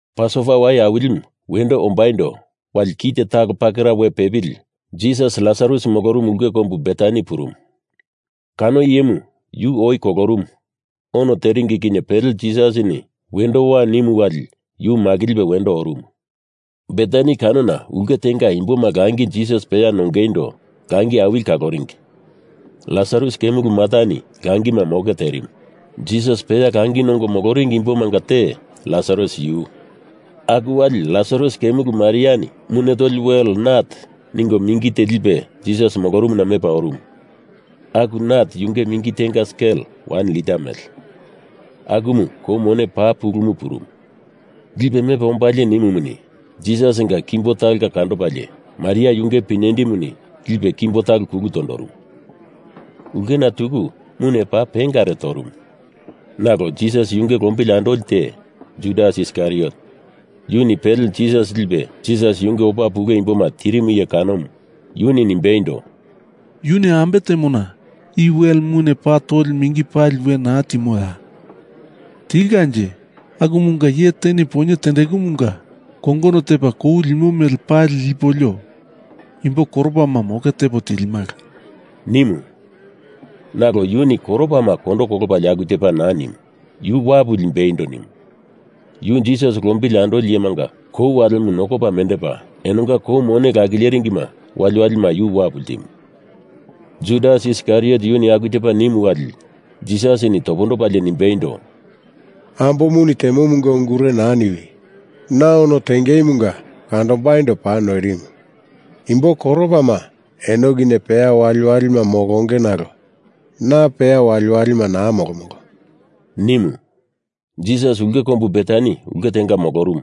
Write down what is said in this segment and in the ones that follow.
Pasova Wai Awilimu, wendo ombaindo wali kite talo pakera we pepili Jisas Lasarus molorumu ulke kombu Betani purumu. Kano iyemu yu oi kolorumu ono teringi kinye pele Jisasini wendo wa nimu wali yu makilipe wendo orumu. Betani kanona ulke tenga imboma langi Jisas peya nongeindo langi awili kaloringi. Lasarus kemulu Martani langima moke terimu. Jisas peya langi nongo moloringi imbomanga te Lasarus yu. Aku wali Lasarus kemulu Mariani mune toli wel nat ningo mingi te lipe Jisas molorumuna mepa orumu. Aku nat yunge mingi tenga skel wan lita mele, akumu kou mone paa pulumu purumu. Lipe mepa ombalie nimumuni, Jisasinga kimbo talonga kandopalie Maria yunge pinyendimu lipe kimbo talo kulu tondorumu. Ulkena tuku mune paa pengare torumu. Nalo Jisas yunge lombili andoli te, Judas Iskariot, yuni pele Jisas lipe Jisas yunge opa pule imboma tirimu iye kanomu, yuni nimbeindo, “Yuni ambe temona i wele mune paa toli mingi pali we naa timoya? Tilkanje akumunga iye teni poinye tendekumunga kongono tepa kou limo mele pali lipolio imbo koropama moke tepo tilimala,” nimu. Nalo yuni koropama kondo kolopalie aku tepa naa nimu. Yu wapu limbeindo nimu. Yu Jisas lombili andoli iyemanga kou walemu nokopa mendepa, enonga kou mone lakileringima waliwalima yu wapu ltimu. Judas Iskariot yuni aku tepa nimu wali Jisasini topondopalie nimbeindo, “Ambomuni temomunga ungure naa niwi! Na ono tengeimunga kandombaindo paa noirimu. Imbo koropama eno kinye peya waliwalima molonge nalo na peya waliwalima naa molomolo,” nimu. Jisas ulke kombu Betani ulke tenga molorumu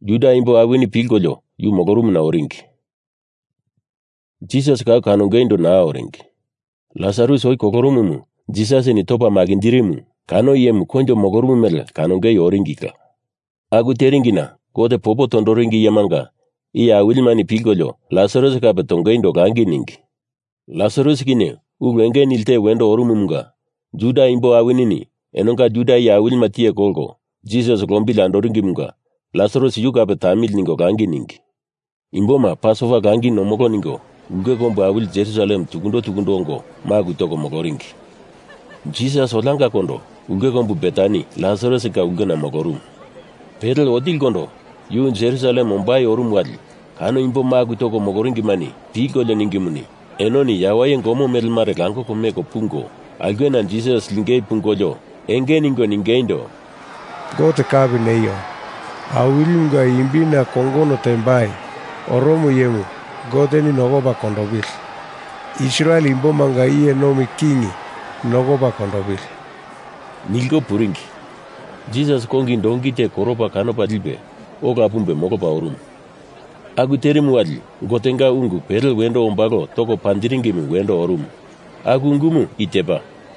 Juda imbo awini pilkolio yu molorumuna oringi. Jisas kau kanongeindo naa oringi. Lasarus oi kolorumu Jisasini topa makinjirimu kano iyemu koinjo molorumu mele kanongei oringila. Aku teringina Gote popo tondoringi iyemanga iye awilimani pilkolio Lasarus kape tongeindo langi ningi. Lasarus kinye ulu enge nili te wendo orumumunga Juda imbo awini enonga Juda iye awilima tiye kolko Jisas lombili andoringimunga Lasarus yu kape tamili ningo langi ningi. Imboma Pasova Langi nomolo ningo ulke kombu awili Jerusalem tukundo tukundo ongo maku toko moloringi. Jisas oliangakondo ulke kombu Betani Lasarusinga ulkena molorumu. Pele otilikondo yu Jerusalem ombai orumu wali kano imbo maku toko moloringimani pilkolio ningimuni, enoni yawaye gomo mele mare langoko meko pungo, aulkena Jisas lingei pungolio enge ningo ningeindo, “Gote kapi neio! Awilimunga imbina kongono tembai oromo iyemu Goteni nokopa kondopili! Israel imbomanga iye nomi King nokopa kondopili!” nilko puringi. Jisas kongi donki te koropa kanopa lipe, ola pumbe molopa orumu. Aku terimu wali Gotenga ungu pele wendo ombalo toko panjiringimu wendo orumu. Aku ungumu i tepa,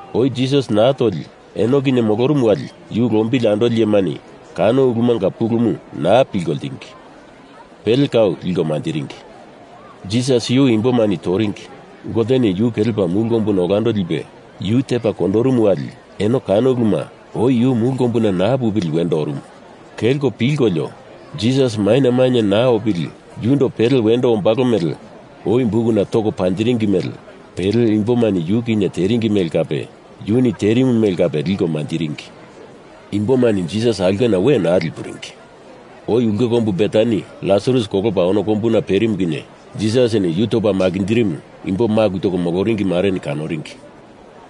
Oi Jisas naa toli eno kinye molorumu wali yu lombili andolimani kano ulumanga pulumu naa pilko ltingi, pele kau liko manjiringi. Jisas yu imbomani toringi Goteni yu kelepa mulu kombuna olando lipe yu tepa kondorumu wali eno kano uluma, oi yu mulu kombuna naa pupili wendo orumu, kelko pilkolio, Jisas maina mainye naa opili yundo pele wendo ombalo mele oi bukuna toko panjiringi mele pele imbomani yu kinye teringi mele kape yuni terimu mele kape liko manjiringi. Imbomani Jisas aulkena we naa lipuringi. Oi ulke kombu Betani Lasarus kolopa ono kombuna perimu kinye Jisasini yu topa makinjirimu imbo maku toko moloringi mareni kanoringi.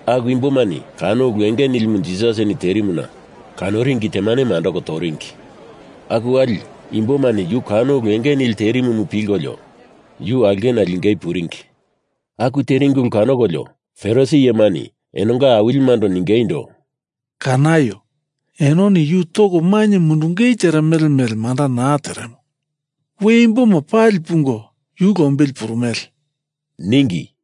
Aku imbomani kano ulu enge nilimu Jisasini terimuna kanoringi temanemu andoko toringi. Aku wali imbomani yu kano ulu enge nili terimumu pilkolio yu aulkena lingei puringi. Aku teringi ulu kanokolio Farisi iyemani enonga awilimando ningeindo, “Kanaio! Enoni yu toko mainye mundungei teremele mele manda naa teremo. We imboma pali pungo yu lombili purumele,” ningi.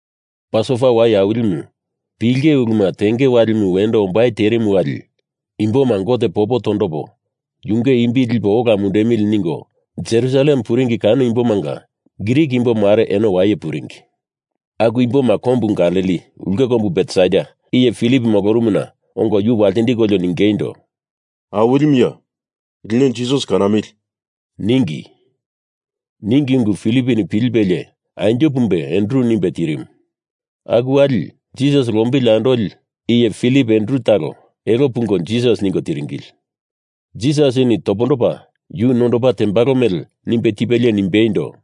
Pasova Wai Awilimu pilinge uluma tengei walimu wendo ombai terimu wali imboma Gote popo tondopo yunge imbi lipo ola mundemili ningo Jerusalem puringi kano imbomanga Grik imbo mare eno waye puringi. Aku imboma kombu Galili ulke kombu Betsaida iye Filip molorumuna ongo yu waltindiko ningeindo, “Awilimuya, lino Jisas kanamili!” ningi. Ningi ungu Filiponi pilipelie anjo pumbe Andru nimbe tirimu. Aku wali Jisas lombili andoli iye Filip Andru talo elo pungo Jisas ningo tiringili. Jisasini topondopa yu nondopa tembalo mele nimbe tipelie nimbeindo,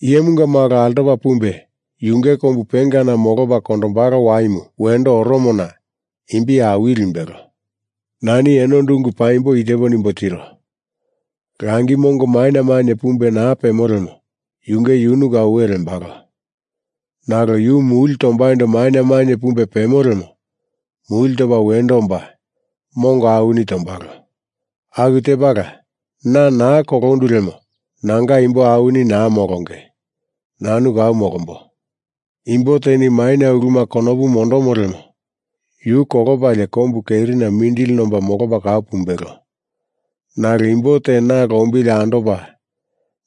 “Iyemunga Malo altopa pumbe yunge kombu pengana molopa kondombalo waimu wendo oromona imbi awili limbelo. Nani enondo ungu paimbo i tepo nimbo tiro. Langi mongo maina mainye pumbe naa pemo lemo yunge yunu kau we lembalo. Nalo yu muli tombaindo maina mainye pumbe pemo lemo muli topa wendo omba mongo awini tombalo. Aku tepala na naa kolondu lemo nanga imbo awini naa molonge, nanu kau molombo. Imbo teni maina uluma konopu mondomo lemo yu kolopalie kombu kerina mindili nomba molopa kau pumbelo. Nalo imbo te na lombili andopa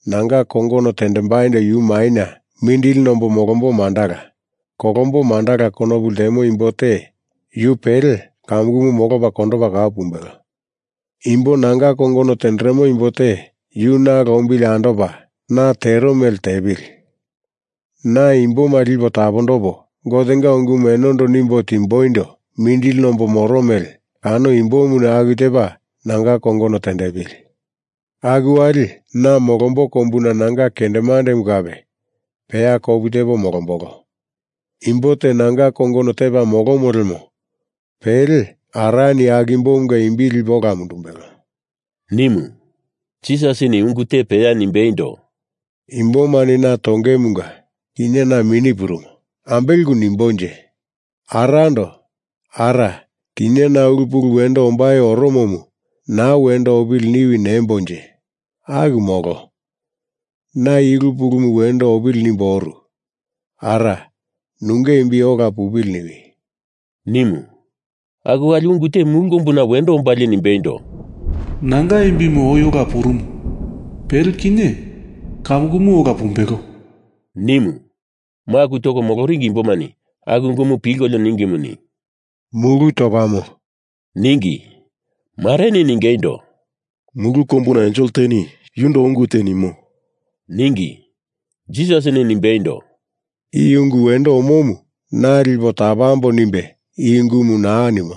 nanga kongono tendembaindo yu maina mindili nombo molombo mandala, kolombo mandala konopu lemo imbo te yu pele kamukumu molopa kondopa kau pumbelo. Imbo nanga kongono tenderemo imbo te yu na lombili andopa na tero mele tepili! Na imboma lipo tapondopo, Gotenga ungumu enondo nimbo timboindo mindili nombo moro mele kano imbomuni aku tepa nanga kongono tepili! Aku wali na molombo kombuna nanga kendemande kape peya kopu tepo molombolo. Imbo te nanga kongono tepa molomo lemo pele Arani aku imbomunga imbi lipe ola mundumbelo,” nimu. Jisasini ungu te peya nimbeindo, “Imbomani na tongeimunga kinye na mini purumo. Ambele ungu nimbonje? Arando Ara, kinye na ulu pulu wendo ombai oromomu naa wendo opili niwi nembonje? Aku molo. Na i ulu pulumu wendo opili nimbo oru. Ara, nunge imbi ola pupili niwi,” nimu. Aku wali ungu te mulu kombuna wendo ombalie nimbeindo, “Nanga imbimu oi ola purumu. Pele kinye kamukumu ola pumbelo,” nimu. Maku toko moloringi imbomani aku ungumu pilkolio ningimuni, “Mulu topamo,” ningi. Mareni ningeindo, “Mulu kombuna ensel teni yundo ungu te nimo,” ningi. Jisasini nimbeindo, “I ungu wendo omomu na lipo tapambo nimbe i ungumu naa nimo.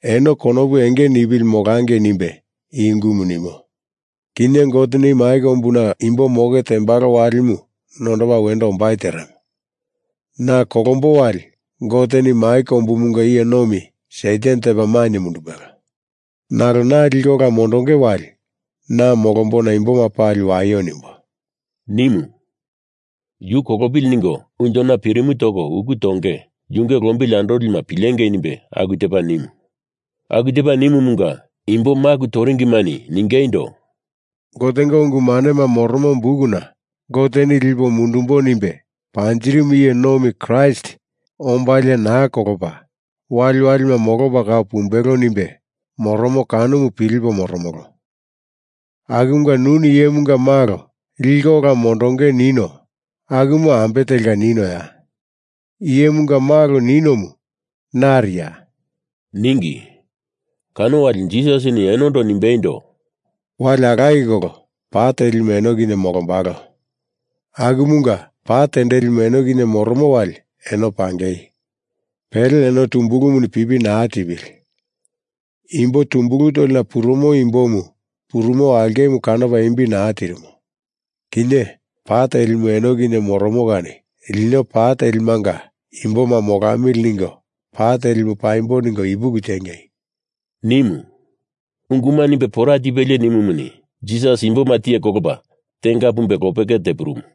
Eno konopu enge nipili molangei nimbe i ungumu nimo. Kinye Goteni mai kombuna imboma moke tembalo walimu nondopa wendo ombai teremo. Na kolombo wali Goteni mai kombumunga iye nomi Satan tepa mainye mundumbelo. Nalo na liko ola mondonge wali na molombona imboma pali waio nimbo,” nimu. Yu kolopili ningo unjona pirimu toko uku tonge yunge lombili andolima pilengei nimbe aku tepa nimu. Aku tepa nimumunga imbo maku toringimani ningeindo, “Gotenga Ungu Manema Moromo Bukuna Goteni lipo mundumbo nimbe panjirimu iye nomi Kraist ombalie naa kolopa, waliwalima molopa kau pumbelo nimbe moromo kanomu pilipo moromolo. Akumunga nuni Iyemunga Malo liko ola mondonge nino akumu ambe telka ninoya? Iyemunga Malo ninomu nariya?” ningi. Kano wali Jisasini enondo nimbeindo, “Wali alaye kolo pa telimu eno kinye molombalo. Akumunga pa tendelimu eno kinye moromo wali eno pangei! Pele eno tumbulumuni pipi naa tipili! Imbo tumbulu tolina purumo imbomu purumo aulkemu kanopa imbi naa tirimo. Kinye pa telimu eno kinye moromo kani lino pa telimanga imboma molamili ningo pa telimu paimbo ningo ipuki tiengei!” nimu. Unguma nimbe pora tipelie nimumuni, Jisas imboma tiye kolopa tenga pumbe lopeke tepurumu.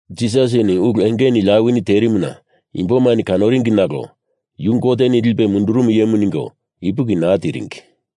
Jisasini ulu enge nili awini terimuna imbomani kanoringi nalo yu Goteni lipe mundurumu iyemu ningo ipuki naa tiringi.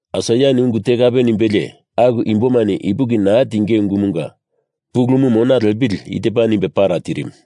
Aisaiani ungu te kape nimbelie aku imbomani ipuki naa tinge ungumunga pulumu mona lepili i tepa nimbe para tirimu: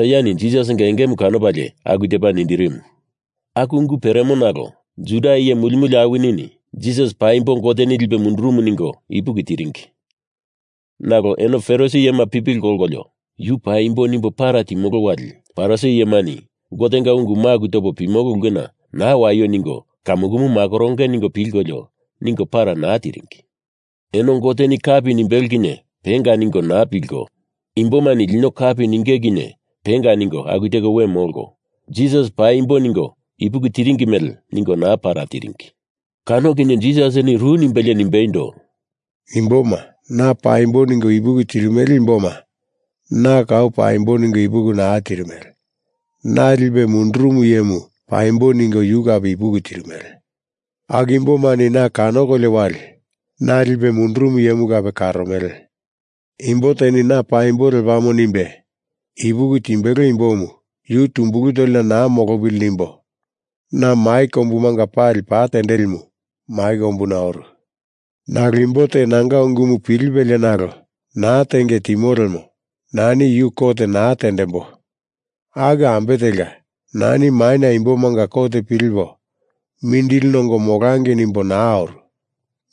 Aisaiani Jisasinga engemu kanopalie aku tepa nindirimu. Aku ungu peremo nalo Juda iye muli muli awinini Jisas paimbo Goteni lipe mundurumu ningo ipuki tiringi. Nalo eno Farisi iyema pipili kolkolio, yu paimbo nimbo para timolo wali Farisi iyemani Gotenga ungu maku topo pimolo ulkemanga naa waio ningo kamukumu makoronge ningo pilkolio, ningo para naa tiringi. Eno Goteni kapi nimbelo kinye penga ningo naa pilko, imbomani lino kapi ninge kinye penga ningo aku teko we molko, Jisas paimbo ningo ipuki tiringi mele ningo para naa tiringi. Kano kinye Jisasini ru nimbelie nimbeindo, “Imboma na paimbo ningo ipuki tirimele imboma na kau paimbo ningo ipuki naa tirimele. Na lipe mundurumu iyemu paimbo ningo yu kape ipuki tirimele. Aku imbomani na kanokolio wali na lipe mundurumu iyemu kape karomele. Imbo teni na paimbo lepamo nimbe ipuki timbelo imbomu, yu tumbulu tolina naa molopili nimbo na mai kombumanga pali pa tendelimu mai kombuna oru. Nalo imbo te nanga ungumu pilipelie nalo naa tenge timo lemo nani yu kot naa tendembo, aku ambe telka, nani maina imbomanga kot pilipo mindili nongo molangei nimbo naa oru.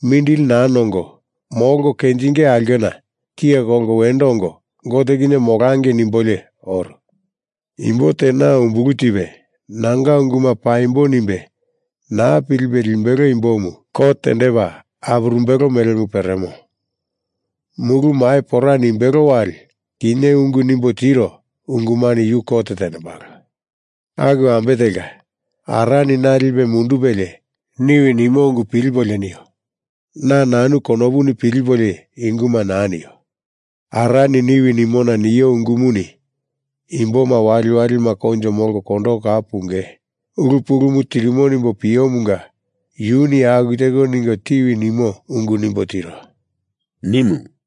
Mindili naa nongo, molko kenjingei aulkena tiye kolko wendo ongo Gote kinye molangei nimbolio oru. Imbo te na umbulu tipe nanga unguma paimbo nimbe naa pilipe limbelo imbomu kot tendepa apurumbelo melemu peremo. Mulu mai pora nimbelo wali kinye ungu nimbo tiro ungumani yu kot tendembalo. Aku ambe telka, Arani na lipe mundupelie niwi nimo ungu pilipolio nio. Na nanu konopuni pilipolio i unguma naa nio. Arani niwi nimona nio ungumuni imboma waliwalima koinjo molko kondoko kau punge ulu pulumu tirimo nimbo piomunga yuni aku teko ningo tiwi nimo ungu nimbo tiro,” nimu.